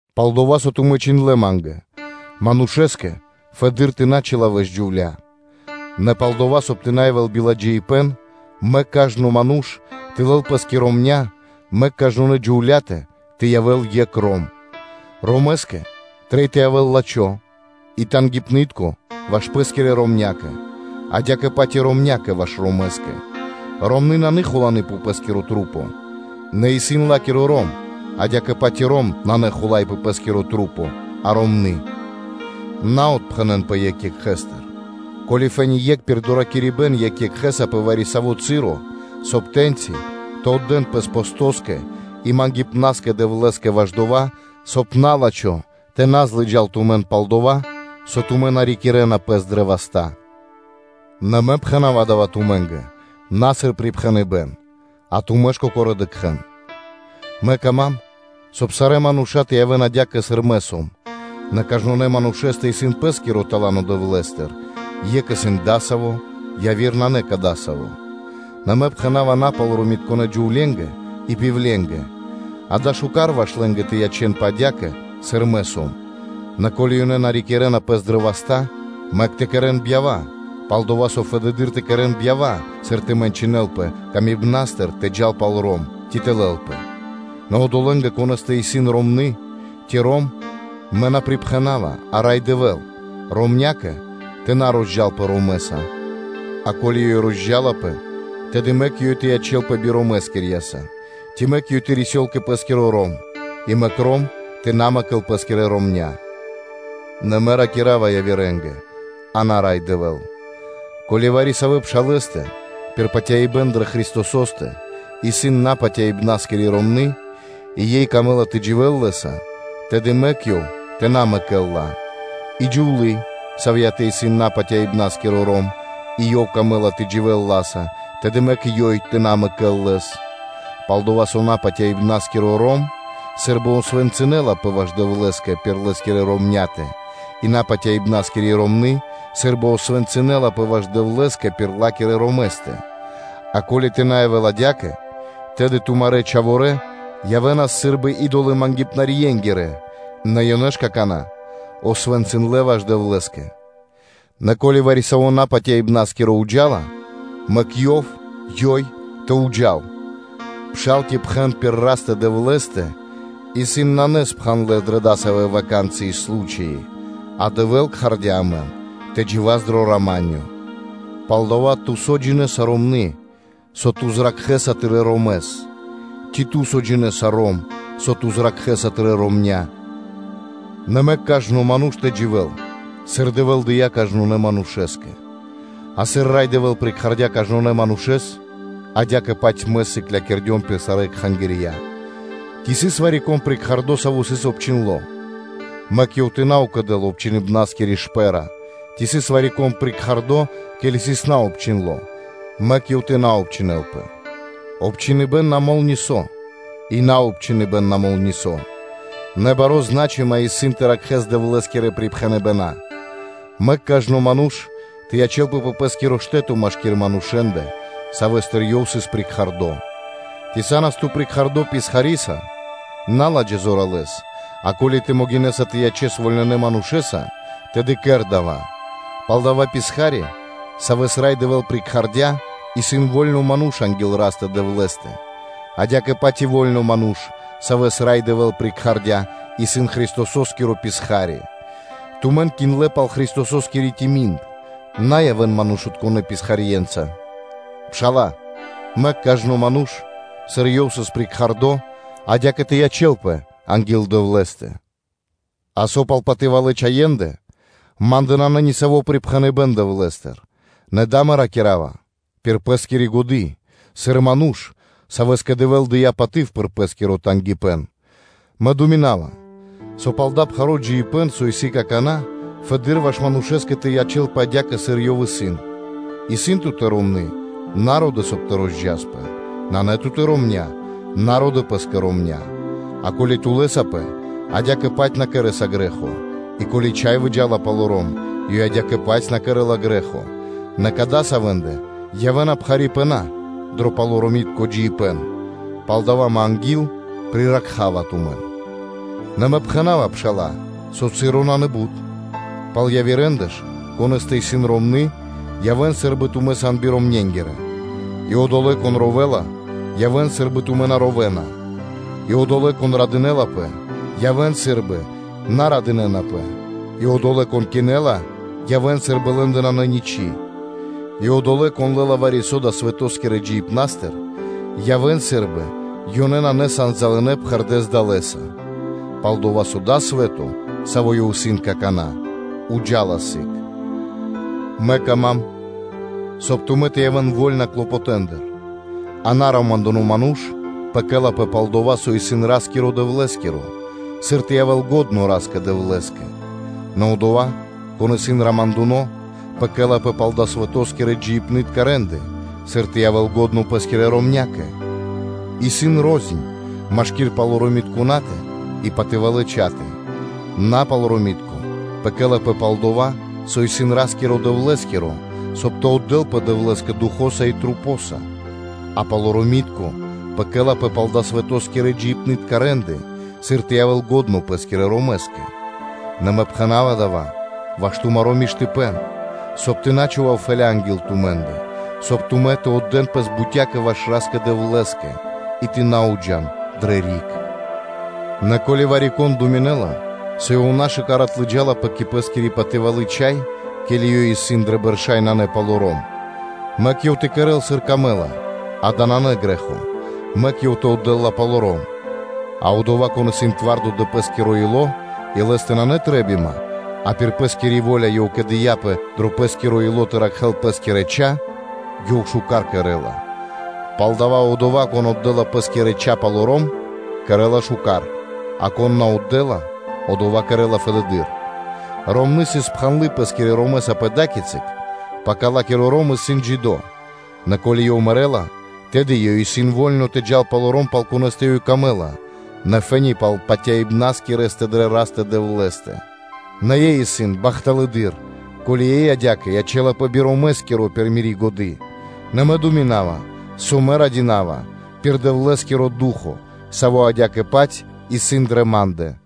Пал дова́, со тумэ́ чхиндлэ́ ма́нгэ: манушэ́скэ фэды́р тэ на чилавэл (тэ на джинэ́л) джувля́; нэ палдова́, соб (кай) тэ на явэ́л биладжаипэ́н, мэк кажно ману́ш тэ лэл пэ́скэ ромня́, мэк кажнонэ́ (сваконэ) джувля́тэ тэ явэ́л екх ром. Ромэскэ трэй тэ явэ́л лачхо́ и тангипны́тко ваш пэ́скирэ ромнякэ; адя́кэ-паць и ромнякэ ваш ромэскэ. Ромны́ исын на хуланы пэ пэ́скирэ маса́, нэ исын ла́киро ром; адя́кэ-паць и ром исын на хула́й пэ пэ́скирэ маса́, а ромны́. На отпхэнэнпэ екх екхэстыр, ко́ли фэ́ни (то́ка) екх пир доракирибэ́н екх екхэ́са пэ вари-саво́ часо, соб (кай) тэ́ньчи тэ отдэ́н пэс постоскэ и патерьякэ (молитвакэ) Дэвлэ́скэ ваш дова́, соб (кай) на́лачхо тэ на злыджал тумэн пал дова́, со тумэ́ на рикирэ́на пэс дрэ васта́. Нэ мэ пхэна́ва дава́ тумэ́нгэ на сыр припхэныбэ́н, а тумэ́ ж кокорэ́ дыкхэ́н. Мэ кама́м, соб (кай) сарэ́ мануша́ тэ явэ́н адя́кэ, сыр мэ сом: нэ кажнонэ́ (сваконэ) манушэ́стэ исын пэ́скиро тала́но Дэвлэ́стыр, екх исын дасаво, яви́р нанэ дасаво. Нэ мэ пхэна́ва напалоромитконэ́ джувле́нгэ и пивленгэ (удовэнгэ): дава́ исын шука́р ваш лэ́нгэ тэ ячэ́нпэ адя́кэ, сыр мэ сом. Нэ ко́ли ёнэ на рикирэ́на пэс дрэ васта́, мэк тэ кэрэ́н бьява; пал-дова́ со фэды́р тэ кэрэ́н бьява, сыр тэ мэнчынэлпэ камибна́стыр тэ джал палоро́м, ци тэ лэлпэ. Нэ одолэ́нгэ, конэ́стэ исын ромны́ ци ром, мэ на припхэнава, а Рай Дэвэ́л; ромнякэ тэ на розджалпэ ромэса; а ко́ли ж ёй розджалапэ, тэды мэк ёй тэ ячэ́лпэ биромэскирьяса, ци мэк ёй тэ рисёл кэ пэ́скиро ром; и мэк ром тэ на мэкэл пэ́скирэ ромня́. Нэ мэ ракира́ва явирэ́нгэ, а на Рай Дэвэ́л: ко́ли вари-савэ́ пшалэ́стэ пир патяибэ́н дрэ Христосо́стэ исын напатяибнаскири ромны́, и ёй камэ́ла тэ дживэ́л лэ́са, тэды мэк ёв тэ на мэкэл ла. И джувлы́, савьятэ исын напатяибнаскиро ром, и ёв камэ́ла тэ дживэ́л ла́са, тэды мэк ёй тэ на мэкэл лэс. Пал-дова́ со напатяибнаскиро ром сы́рбы освэнцынэлапэ ваш Дэвлэ́скэ пир Лэ́скирэ ромня́тэ, и напатяибнаскири ромны́ сы́рбы освэнцынэлапэ ваш Дэвлэ́скэ пир ла́кирэ ромэстэ; а ко́ли тэ на явэ́л адя́кэ, тэды тумарэ́ чхаворэ́ явэ́нас сы́рбы идолэ-мангипнарьенгирэ; нэ ёнэ ж какана́ освэнцындлэ ваш Дэвлэ́скэ. Нэ ко́ли вари-саво́ напатяибнаскиро уджала, мэк ёв (ёй) тэ джал пэ́скэ, пшал ци пхэн пир Растэ-Дэвлэ́стэ исын на спхандлэ дрэ дасавэ́ ваканцыи (случаи), а Дэвэ́л кхардя́ амэн тэ джива́с дро рама́нё (миро). Палдава́, ту, со джинэ́са, ромние, со ту зракхэ́са тырэ́ ромэс? Ци, ту, со джинэ́са, рома́, со ту зракхэ́са тырэ́ ромня́? Нэ мэк кажно (сва́ко) ману́ш тэ дживэ́л, сыр Дэвэ́л дыя́ кажнонэ́ манушэ́скэ, а сыр Рай Дэвэ́л прикхардя кажнонэ́ манушэ́с: адя́кэ-паць мэ сыклякирдём пир сарэ́ кхангирья. Ци сыс вари-кон прикхардо, саво́ сыс обчхиндло? Мэк ёв тэ на укэдэл обчхиныбнаскири шпэ́ра: ци сыс вари-кон прикхардо, ке́ли сыс наобчхиндло? Мэк ёв тэ на обчхинэлпэ. Обчхиныбэн на мол нисо́, и наобчхиныбэн на мол нисо́; нэ бари зна́чыма исын тэ ракхэ́с Дэвлэ́скирэ припхэныбэна́ (заповеди). Мэк кажно ману́ш тэ ячэ́лпэ пэ пэ́скиро штэ́то машки́р манушэ́ндэ, савэ́стыр ёв сыс кхардо. Ци са́нас ту кхардо писхариса, на ладжа зоралэ́с, а ко́ли тэ могинэ́са тэ ячэс вольнонэ манушэ́са, тэды кэр дава́. Палдава́ писха́ри, савэ́с Рай Дэвэ́л кхардя́ кэ Пэ, исын во́льно ману́ш анги́л Растэ-Дэвлэ́стэ; адя́кэ-паць и во́льно ману́ш, савэ́с Рай Дэвэ́л кхардя́ кэ Пэ, исын Христосо́скиро писха́ри. Тумэн киндлэ пал Христососкири тими́н; на явэ́н манушытконэ́ писхарье́нца. Пшала́лэ, мэк кажно ману́ш, сыр ёв сыс кхардо кэ, адя́кэ тэ ячэ́лпэ анги́л Дэвлэ́стэ. А со пал патывалэ́ чхаендэ, ма́ндэ нанэ ни саво́ припхэныбэ́н Дэвлэ́стыр; нэ дава́ мэ ракира́ва пир пэ́скири годы́ сыр ману́ш, савэ́скэ Дэвэ́л дыя́ паты́в пир Пэ́скиро тангипэ́н. Мэ думинава, со пал дава́ пхаро́ джиибэ́н, со исын какана́, фэды́р ваш манушэ́скэ тэ ячэ́лпэ адя́кэ, сыр ёв исын. Исын ту́тэ ромны́? На ро́дэ, соб (кай) тэ розджаспэ. Нанэ ту́тэ ромня́? На ро́дэ пэ́скэ ромня́. А ко́ли ту лэсапэ, адя́кэ-паць на кэрэ́са грэ́хо, и ко́ли чхай выджа́ла палоро́м, ёй адя́кэ-паць на кэрэ́ла грэ́хо: нэ кадасавэндэ явэ́на мэ́ньки дро палоромитко джиибэ́н, палдава́ мэ анги́л приракхава тумэн. Нэ мэ пхэна́ва, пшала́лэ, со часо нанэ бут. Пал явирэндэ ж; конэ́стэ исын ромны́, явэ́н сы́рбы тумэ́ сан биромненгирэ; и одолэ́, кон ровэла, явэ́н сы́рбы тумэ́ на ровэна; и одолэ́, кон радынэ́лапэ, явэ́н сы́рбы на радынэ́напэ; и одолэ́, кон кинэла, явэ́н сы́рбы лэ́ндэ нанэ ничы́; и одолэ́, кон лэ́ла вари-со далэ́ свэто́скирэ джиибнастыр, явэ́н сы́рбы ёнэ на залынэ пхэрдэ́с далэ́са; пал-дова́ со дава́ свэ́то, саво́ ёв исын какана́, джа́ла криг сы́гэс. Мэ кама́м, соб (кай) тумэ́ тэ явэ́н вольна пиридживипнастыр. А наромандуно ману́ш пэкэлапэ (заботисола) пал дова́, со исын Ра́скиро-Дэвлэ́скиро, сыр тэ явэ́л лачхо́ Ра́скэ-Дэвлэ́скэ; нэ одова́, кон исын романдуно, пэкэлапэ пал далэ́-свэто́скирэ джиибнытка рэ́нды, сыр тэ явэ́л лачхо́ пэ́скирэ ромнякэ. Исын рознь машки́р палоромитконатэ и патывалэ́ чхатэ. Напалоромитко пэкэлапэ пал дова́, со исын Ра́скиро-Дэвлэ́скиро, соб (кай) тэ отдэлпэ Дэвлэ́скэ Духо́са и масэнца; а палоромитко пэкэлапэ пал далэ́-свэто́скирэ джиибнытка рэ́нды, сыр тэ явэ́л лачхо́ пэ́скирэ ромэскэ. Нэ мэ пхэна́ва дава́ ваш тумаро́ миштыпэ́н, соб (кай) тэ на чхував фэлы́ (петля) анги́л тумэ́ндэ, соб (кай) тумэ́ тэ отдэ́н пэс бутякэ ваш Ра́скэ-Дэвлэ́скэ и тэ на уджан дрэ риг. Нэ ко́ли вари-кон думинэ́ла, со ёв нашукар отлыджалапэ кэ пэ́скири патывалы́ чхай, ке́ли ёй исын дрэ бэрша́ и нанэ палоро́м; мэк ёв тэ кэрэ́л, сыр камэ́ла-дава́ нанэ грэ́хо, мэк ёв тэ отдэ́л ла палоро́м. А одова́, кон исын твардо дро пэ́скиро ило́ и лэ́стэ нанэ трэ́бима, а пир пэ́скири во́ля ёв кэдыяпэ дро пэ́скиро ило́ тэ ракхэ́л пэ́скирэ чха, ёв шука́р кэрэ́ла. Палдава́ одова́, кон отдэ́ла пэ́скирэ чха палоро́м, кэрэ́ла шука́р; а кон на отдэ́ла, одова́ кэрэ́ла фэдэды́р. Ромны́ исын сыс спхандлы пэ́скирэ ромэса пэ ада́кицы, пака ла́киро ром исын джидо́; нэ ко́ли ёв мэрэ́ла, тэды ёй исын во́льно тэ джал палоро́м, пал конэ́стэ ёй камэ́ла, нэ фэ́ни пал патяибнаскирэстэ дрэ Растэ-Дэвлэ́стэ. Нэ ёй исын бахталэдыр, ко́ли ёй адя́кэ ячэ́лапэ би ромэскиро пир мири́ годы́; нэ мэ думинава, со мэ радинава (мэ да́ва годы́) дава́ пир Дэвлэ́скиро Ду́хо (Фа́но), саво́ адя́кэ-паць исын дрэ ма́ндэ.